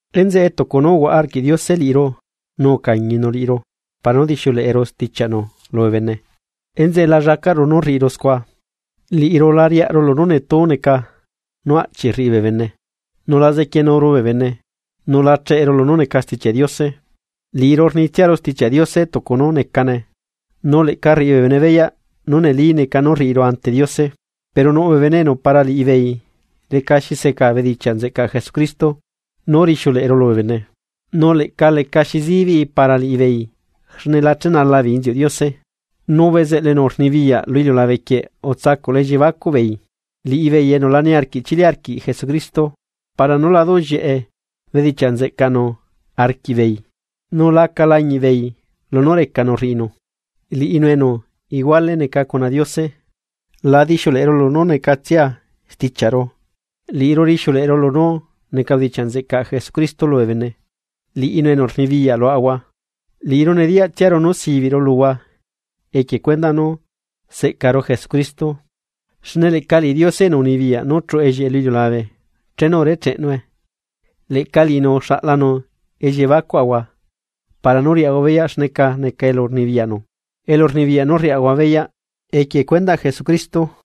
Enzeꞌe tucu nú uhuaꞌa arquiꞌ Diose liꞌiru nú ucañinu liꞌiru para nú dixiuleꞌeru stichiaꞌnu lubee bene, enzeꞌe la llacaꞌru nú rriꞌiru scua. Liꞌiru la riaꞌaru lunú netu neca nú aꞌchi rriꞌi bee bene. Nu la zequienuru bee bene, nu la cheꞌeru lunú neca Stichiaꞌ Diose. Liꞌiru rnitsiaru Stichiaꞌ Diose tucu nú necane. Nu leꞌca rriꞌi bee bene beyaꞌ nú neli neca nú rriꞌiru ante Diose. Pero nuꞌ bee bene enu para liꞌibeei lecaxi seca bedichiaꞌ nzeꞌcaꞌ Jesucristo nú rixiuleꞌeru lubee bene, nu leꞌca lecaxi zibiꞌi para liꞌibeei xne la chenala beei inziuꞌ Diose. Nu bezeꞌlu enu rnibiyaꞌ lu iliulabe quieꞌ utsacuꞌla elliebacuꞌ beei, liꞌibeei enu la niarquiꞌ chili arquiꞌ Jesucristo, para nú la duꞌllieꞌe bedichiaꞌ nzeꞌcaꞌnu arquiꞌbeei nu laca lañiꞌbeei lunú recanu rriꞌinu, liꞌinu enu iguale neca cuna Diose. La dixiuleꞌeru lunú necatsia stichiaꞌru, liꞌiru rixiuleꞌeru lunú neca bedichiaꞌ nzeꞌcaꞌ Jesucristo lubee bene, liꞌinu enu rnibiyaꞌ luaꞌahua. Liꞌiru nediyaꞌtsiaru nú sibiꞌru luhua equie cuendaꞌ nú seꞌcaru Jesucristo. Xne leꞌca liꞌi Diose enu unibiyaꞌ nú chuꞌu ellieꞌe lu iliulabe chenu urecheꞌnue, leꞌca liꞌinu uxaꞌlanu elliebacuaꞌahua para nú riaꞌahua beyaꞌ xneca neca elu rnibiyaꞌnu, elurnibiyaꞌ nú rriaꞌahua beyaꞌ equie cuendaꞌ Jesucristo.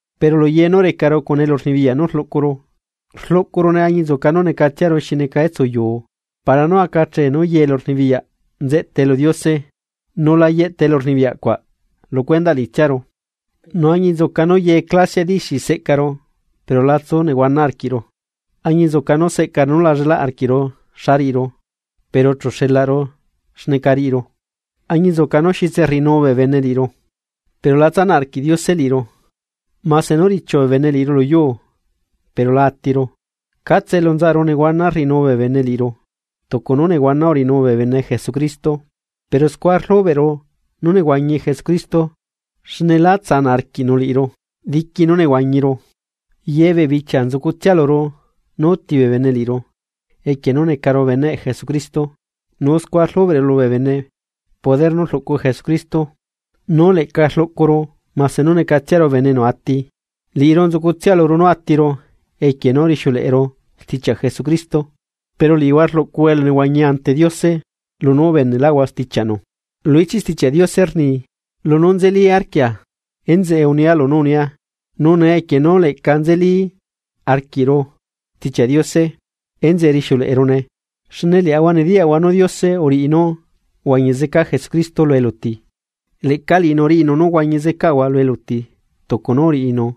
Pero luye nú recaru cuna elurnibiyaꞌ nú rluꞌcuru, rluꞌcurune añinzuca nú necatsiaru xineca etsuyuu para nú aca achee nú ye elurnibiyaꞌ nzeꞌtae lu Diose nu la yeꞌta elu rnibiyaꞌcuaꞌ lu cuendaꞌ liꞌitsiaru. Nu añinzuca nú ye clasiaꞌ dixi seꞌcaru pero la tsu nehuana arquiꞌru, añinzuca nú seꞌcaru nú la llela arquiꞌru xa riꞌiru, pero chu xelaꞌru xneca riꞌiru. Añinzuca nú xitse rriꞌinu bee bene liꞌiru, pero la tsanaꞌ arquiꞌ Diose liꞌiru. Mase nú richiu bee bene liꞌiru lu yuu, pero lá atiru. Catse elu nzaꞌaru nehuana rriꞌinuu bee bene liꞌiru, tucu nú nehuana uriꞌinuu bee bene Jesucristo. Pero scua rlubeꞌru nú nehuañi Jesucristo xne lá tsanaꞌ arquiꞌnu liꞌiru. Diqui nú nehuañiru, yebee bichia nzucutsia luru nú uti bee bene liꞌiru equie nú necaru beneꞌ Jesucristo nu scua rlubeꞌru lubee bene poder nú rluꞌcu Jesucristo nú leꞌca rluꞌcuru, mase nú necatsiaru bene enu ati. Liꞌiru nzucutsia luru nú atiru equie nú rixiuleꞌeru stichiaꞌ Jesucristo, pero liꞌihua rluꞌcuhua elunehuañi ante Diose lunú ubeneꞌlaꞌhua stichiaꞌnu. Lu ichiꞌ Stichiaꞌ Diose rni: “Lunú nzeli arquia, enzeꞌe unia lunú unia”, nu nee equie nú leꞌca nzeli arquiꞌru Stichiaꞌ Diose enzeꞌe rixiuleꞌerune. Xne liaꞌahua nediyaꞌahua nú Diose uriꞌi nú uhuañi zeca Jesucristo lu eluti, leꞌca liꞌinu riꞌinu nú huañi zecaꞌahua lu eluti tucu nú uriꞌinu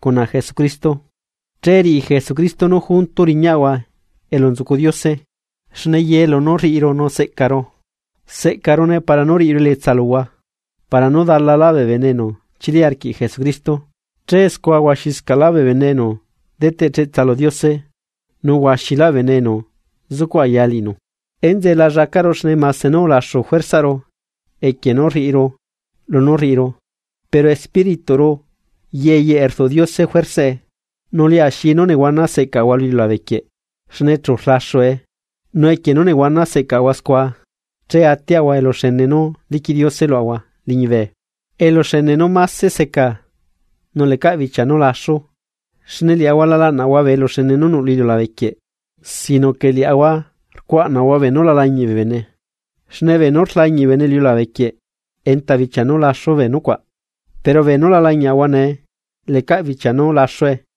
cuna Jesucristo. Che riꞌi Jesucristo nú junto riñaꞌahua elu nzucu Diose. Xne ye lunú rriꞌiru nu seꞌcaru, seꞌcarune para nú riꞌiru elietsa luhua para nú dalalá bee bene enu chili arquiꞌ Jesucristo. Che scua huaxila bee bene enu deteꞌ cheꞌtsa lu Diose, nu huaxila bee bene enu zucuꞌ aya liꞌinu. Enzeꞌe la llacaꞌru xne mase nú ulaxu juersaꞌru equie nú rriꞌiru lunú rriꞌiru, pero espírituꞌru yeyeꞌe rduꞌ Diose juersaꞌe. Nu liaxi nú nehuana seꞌcaꞌahua lu iliulabe quieꞌ xne chu rlaxue nu equie nú nehuana secahua scua che atiaꞌahua eluxene nú liquiꞌ Diose luaꞌahua liñibe, eluxene nú máse seca nu lecaꞌ bichia nú laxu. Xne liaꞌahua la laꞌnaꞌahua bee eluxene nú nuꞌ lu iliulabe quieꞌ sino que liaꞌahua rcuaꞌnaꞌahua beenú la lañiꞌ bee bene, xne beenú rlañiꞌ bee bene lu iliulabe quieꞌ enta bichia nú laxu bee nucuaꞌ, pero beenú la lañiaꞌahua nee, lecaꞌ bichia nú laxue.